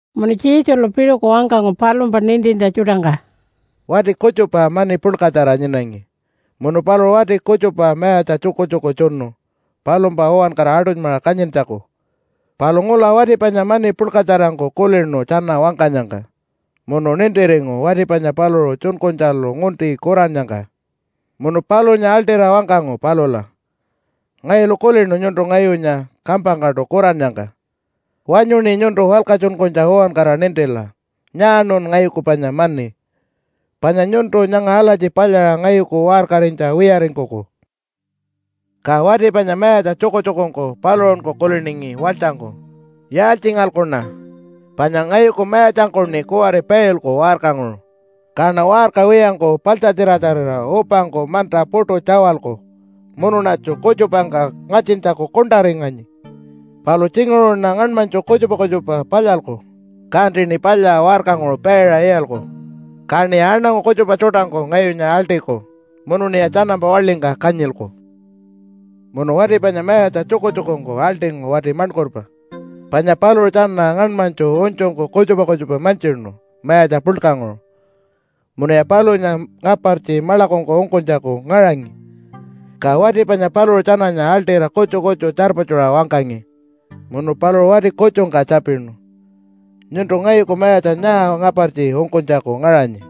Munu Jesulu piṟuku wangkangu palumpa nintintja tjuṯangka, “Wati kutjupa mani puḻkatjara nyinangi, munu paluṟu wati kutjupa mayatja tjukutjuku tjunu palumpa uwankara aṯunymaṟa kanyintjaku. Palu ngula wati panya mani puḻkatjarangku kulinu tjana wangkanyangka munu nintiringu wati panya paluṟu tjunkunytjalu ngunti kurannyangka. Munu palunya aḻṯira wangkangu palula, ‘Ngayulu kulinu nyuntu ngayunya kampangkaṯu kurannyangka. Wanyuṉi nyuntu walkatjunkunytja uwankara nintila nyaaṉun ngayuku panya mani, panya nyuntu nyanga alatji palyaṟa ngayuku waṟkarinytja wiyaringkuku.’ “Ka wati panya mayatja tjukutjukungku paluṟunku kuliningi walytjangku, ‘Yaaltjingalkuṉa? Panya ngayuku mayatjangkuṉi kuwari pailku waṟkanguṟu, kaṉa waṟka wiyangku paḻtjatjiratjarira upangku manta puṯu tjawalku munuṉatju kutjupangka ngatjintjaku kuṉṯaringanyi. Palu tjinguṟuṉa ngaṉmanytju kutjupa kutjupa palyalku, kantiṉi palya waṟkanguṟu paiṟa iyalku. Kaṉiya aṉangu kutjupa tjuṯangku ngayunya aḻṯiku munuṉiya tjanampa waḻingka kanyilku.’ “Munu wati panya mayatja tjukutjukungku aḻṯingu wati maṉkurpa, panya paluṟu tjana ngaṉmanytju unytjungku kutjupa kutjupa mantjinu mayatja puḻkanguṟu munuya palunya ngapartji maḻakungku ungkunytjaku ngaṟangi. Ka wati panya paluṟu tjananya aḻṯira kutju kutju tjarpatjuṟa wangkangi. Munu paluṟu wati kutjungka tjapinu, ‘Nyuntu ngayuku mayatja nyaa ngapartji ungkunytjaku ngaṟanyi?’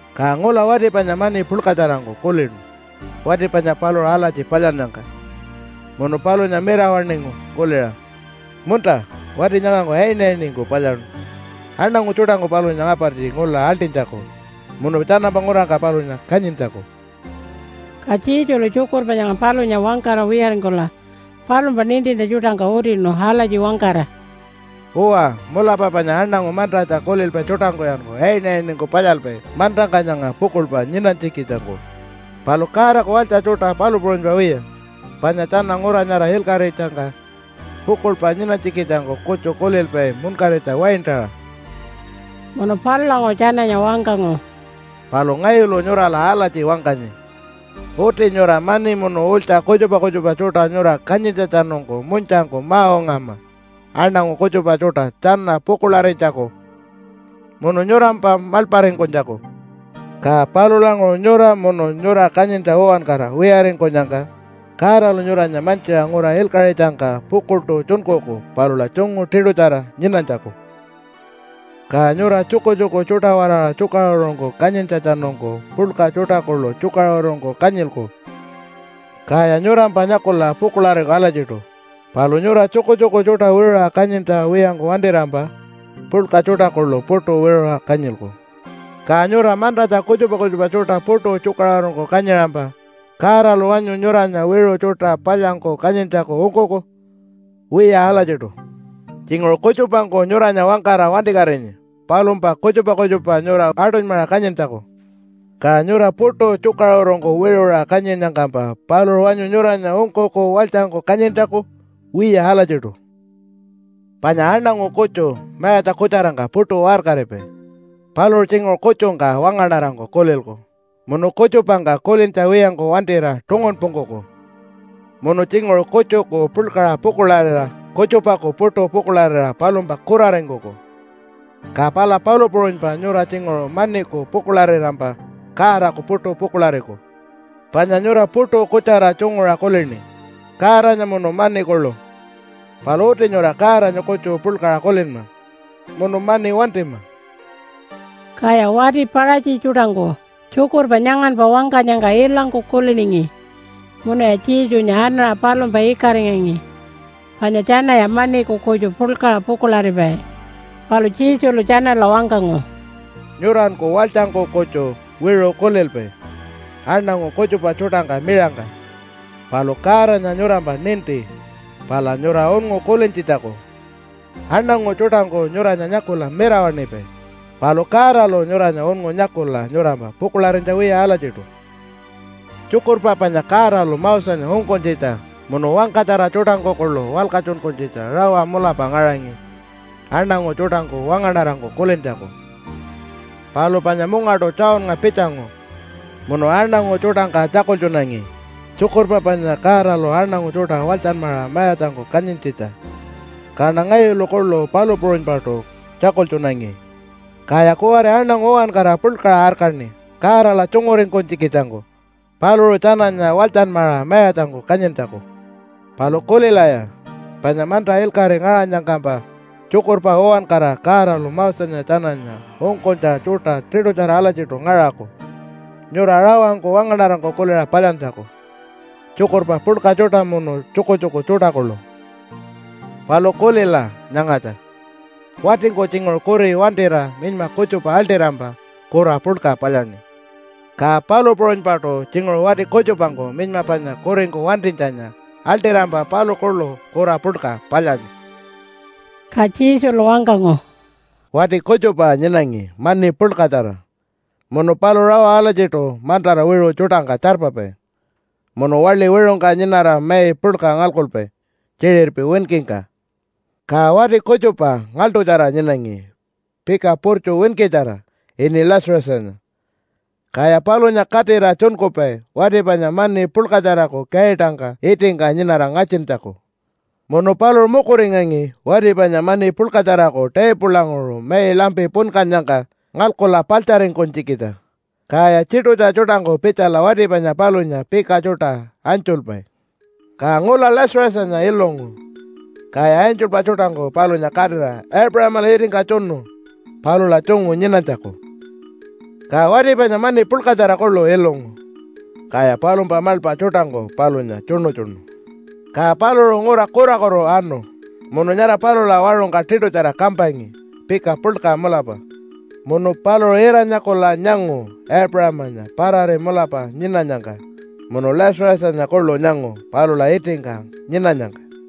“Ka ngula wati panya mani puḻkatjarangku kulinu wati panya paluṟu alatji palyannyangka, munu palunya mirawaṉingu kuliṟa, ‘Munta, wati nyangangku ayinayiningku palyaṉu aṉangu tjuṯangku palunya ngapartji ngula aḻṯinytjaku munu tjanampa ngurangka palunya kanyintjaku.’” Ka Jesulu tjukurpa nyanga palunya wangkara wiyaringkula palumpa nintintja tjuṯangka utinu alatji wangkara, “Uwa, mulapa panya aṉangu mantatja kulilpai tjuṯangkuyanku ayinayiningku palyalpai mantangka nyanga pukuḻpa nyinanytjikitjangku, palu Godaku walytja tjuṯa palu puṟunypa wiya, panya tjana ngura nyara ilkaṟitjangka pukuḻpa nyinanytjikitjangku kutju kulilpai munkaritja waintaṟa.” Munu palulanguṟu tjananya wangkangu, “Palu ngayulu nyurala alatji wangkanyi. Uti nyura mani munu ulytja kutjupa kutjupa tjuṯa nyura kanyintjatjanungku munytjangku ma-ungama aṉangu kutjupa tjuṯa tjana pukuḻarinytjaku munu nyurampa maḻparingkunytjaku. Ka palulanguṟu nyura munu nyura kanyintja uwankara wiyaringkunyangka Godalu nyuranya mantjiṟa ngura ilkaṟitjangka pukuḻṯu tjunkuku palula tjungu tiṯutjara nyinanytjaku. “Ka nyura tjukutjuku tjuṯa-waraṟa tjukaṟurungku kanyintjatjanungku puḻka tjuṯa kuḻu tjukaṟurungku kanyilku, kaya nyurampa nyakula pukuḻariku alatjiṯu. Palu nyura tjukutjuku tjuṯa wiṟuṟa kanyintja wiyangku wantirampa puḻka tjuṯa kuḻu puṯu wiṟuṟa kanyilku. Ka nyura mantatja kutjupa kutjupa tjuṯa puṯu tjukaṟurungku kanyiṟampa Godalu wanyu nyuranya wiṟu tjuṯa palyanyku kanyintjaku ungkuku? Wiya alatjiṯu. Tjinguṟu kutjupangku nyuranya wangkara wantikatinyi palumpa kutjupa kutjupa nyura aṯunymaṟa kanyintjaku, ka nyura puṯu tjukaṟurungku wiṟuṟa kanyinnyangkampa paluṟu wanyu nyuranya ungkuku walytjangku kanyintjaku? Wiya alatjiṯu. “Panya aṉangu kutju mayatja kutjarangka puṯu waṟkaripai. Paluṟu tjinguṟu kutjungka wangaṉarangku kulilku munu kutjupangka kulintja wiyangku wantira tungunpungkuku. Munu tjinguṟu kutjuku puḻkaṟa pukuḻarira kutjupaku puṯu pukuḻarira palumpa kuraringkuku. Ka pala palu puṟunypa nyura tjinguṟu maniku pukuḻarirampa Godaku puṯu pukuḻariku. Panya nyura puṯu kutjara tjunguṟa kulini Godanya munu mani kuḻu. Palu uti nyura Godanya kutju puḻkaṟa kulinma munu mani wantima.” Kaya wati Paṟatji tjuṯangku tjukurpa nyanganpa wangkanyangka ilangku kuliningi munuya Jesunya anaṟa palumpa ikaringangi panya tjanaya maniku kutju puḻkaṟa pukuḻaripai. Palu Jesulu tjanala wangkangu, “Nyuranku walytjangku kutju wiṟu kulilpai aṉangu kutjupa tjuṯangka miṟangka. Palu Godanya nyurampa ninti pala nyura unngu kulintjitjaku. Aṉangu tjuṯangku nyuranya nyakula mirawaṉipai, palu Godalu nyuranya unngu nyakula nyurampa pukuḻarinytja wiya alatjiṯu. “Tjukurpa panya Godalu Mosenya ungkunytjitja munu wangkatjara tjuṯangku kuḻu walkatjunkunytjitja rawa mulapa ngaṟangi aṉangu tjuṯangku wangaṉarangku kulintjaku. Palu panya mungaṯu Johnnga pitjangu munu aṉangu tjuṯangka tjakultjunangi tjukurpa panya Godalu aṉangu tjuṯa walytjanmaṟa mayatjangku kanyintjitja, kaṉa ngayulu kuḻu palu puṟunypaṯu tjakultjunangi. Kaya kuwari aṉangu uwankara puḻkaṟa arkaṉi Godala tjunguringkunytjikitjangku paluṟu tjananya walytjanmaṟa mayatjangku kanyintjaku. Palu kulilaya, panya manta ilkaṟi ngaṟanyangkampa tjukurpa uwankara Godalu Mosenya tjananya ungkunytja tjuṯa tiṯutjara alatjiṯu ngaṟaku nyura rawangku wangaṉarangku kuliṟa palyantjaku, tjukurpa puḻka tjuṯa munu tjukutjuku tjuṯa kuḻu. “Palu kulila nyangatja! Watingku tjinguṟu kuri wantira minyma kutjupa aḻṯirampa kura puḻka palyaṉi. Ka palu puṟunypaṯu tjinguṟu wati kutjupangku minyma panya kuringku wantinytjanya aḻṯirampa paluṟu kuḻu kura puḻka palyaṉi.” Ka Jesulu wangkangu, “Wati kutjupa nyinangi mani puḻkatjara munu paluṟu rawa alatjiṯu mantara wiṟu tjuṯangka tjarpapai munu waḻi wiṟungka nyinara mai puḻka ngalkupai tjiṟirpi winkingka. Ka wati kutjupa ngaḻṯutjara nyinangi pika purtju winkitjara ini Lazarusanya. Kaya palunya katira tjunkupai wati panya mani puḻkatjaraku kaitangka itingka nyinara ngatjintjaku. Munu paluṟu mukuringangi wati panya mani puḻkatjaraku taipulanguṟu mai lampi punkannyangka ngalkula paḻtjaringkunytjikitja. Kaya tjiṯutja tjuṯangku pitjala wati panya palunya pika tjuṯa anytjulpai. Ka ngula Lazarusanya ilungu. Kaya angelpa tjuṯangku palunya katira Aipuṟamala itingka tjunu palula tjungu nyinanytjaku. “Ka wati panya mani puḻkatjara kuḻu ilungu. Kaya palumpa maḻpa tjuṯangku palunya tjuṉutjunu. Ka paluṟu ngura kurakutu anu, munu nyara palula waṟungka tiṯutjara kampangi pika puḻka mulapa. Munu paluṟu ira-nyakula nyangu Aipuṟamanya parari mulapa nyinanyangka munu Lazarusanya kuḻu nyangu palula itingka nyinanyangka.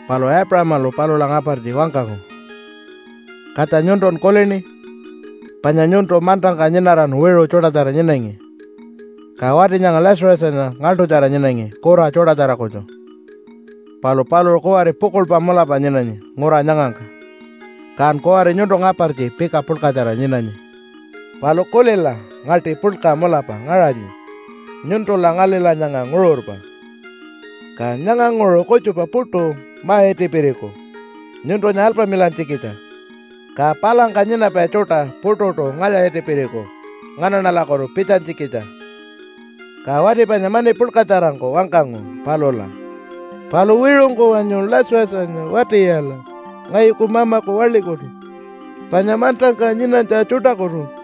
“Palu Aipuṟamalu palula ngapartji wangkangu, ‘Katja, nyuntun kulini? Panya nyuntu mantangka nyinaran wiṟu tjuṯatjara nyinangi. Ka wati nyanga Lazarusanya ngaḻṯutjara nyinangi kura tjuṯatjara kutju. Palu paluṟu kuwari pukuḻpa mulapa nyinanyi ngura nyangangka. Kan kuwari nyuntu ngapartji pika puḻkatjara nyinanyi. Palu kulila ngaṯi puḻka mulapa ngaṟanyi nyuntula ngalila nyanga nguṟurpa. Ka nyanganguṟu kutjupa puṯu ma-itipiriku nyuntunya alpamilantjikitja. Ka palangka nyinapai tjuṯa puṯuṯu ngalya-itipiriku nganaṉalakutu pitjanytjikitja.’ “Ka wati panya mani puḻkatjarangku wangkangu palula, ‘Palu wiṟungku wanyu Lazarusanya wati-iyala ngayuku mamaku waḻikutu panya mantangka nyinanytja tjuṯakutu.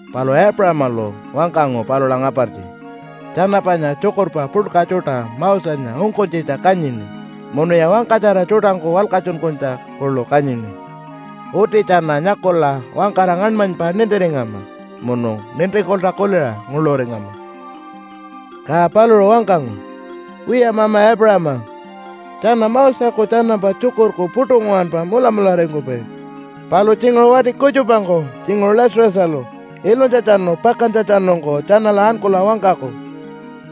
“Palu Aipuṟamalu wangkangu palula ngapartji, ‘Tjana panya tjukurpa puḻka tjuṯa Mosenya ungkunytjitja kanyini munuya wangkatjara tjuṯangku walkatjunkunytja kuḻu kanyini. Uti tjana nyakula wangkara ngaṉmanypa nintiringama munu nintingkulta kuliṟa nguḻuringama.’ “Ka paluṟu wangkangu, ‘Wiya mama Aipuṟama, tjana Moseku tjanampa tjukurku puṯu nguwanpa mulamularingkupai. Palu tjinguṟu wati kutjupangku, tjinguṟu Lazarusalu, ilunytjatjanu pakantjatjanungku tjanala ankula wangkaku,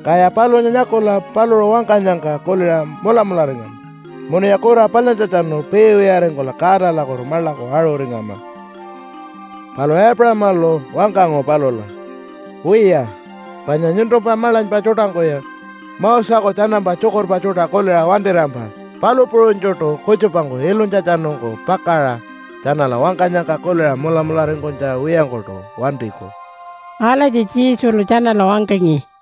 kaya palunya nyakula paluṟu wangkanyangka kuliṟa mulamularingama munuya kura palyantjatjanu piiwiyaringkula Godalakutu maḻaku aṟuringama.’ “Palu Aipuṟamalu wangkangu palula, ‘Wiya, panya nyuntumpa maḻanypa tjuṯangkuya Moseku tjanampa tjukurpa tjuṯa kuliṟa wantirampa palu puṟunytjuṯu kutjupangku ilunytjatjanungku pakaṟa tjanala wangkanyangka kuliṟa mulamularingkunytja wiyangkuṯu wantiku.’” Alatji Jesulu tjanala wangkangi.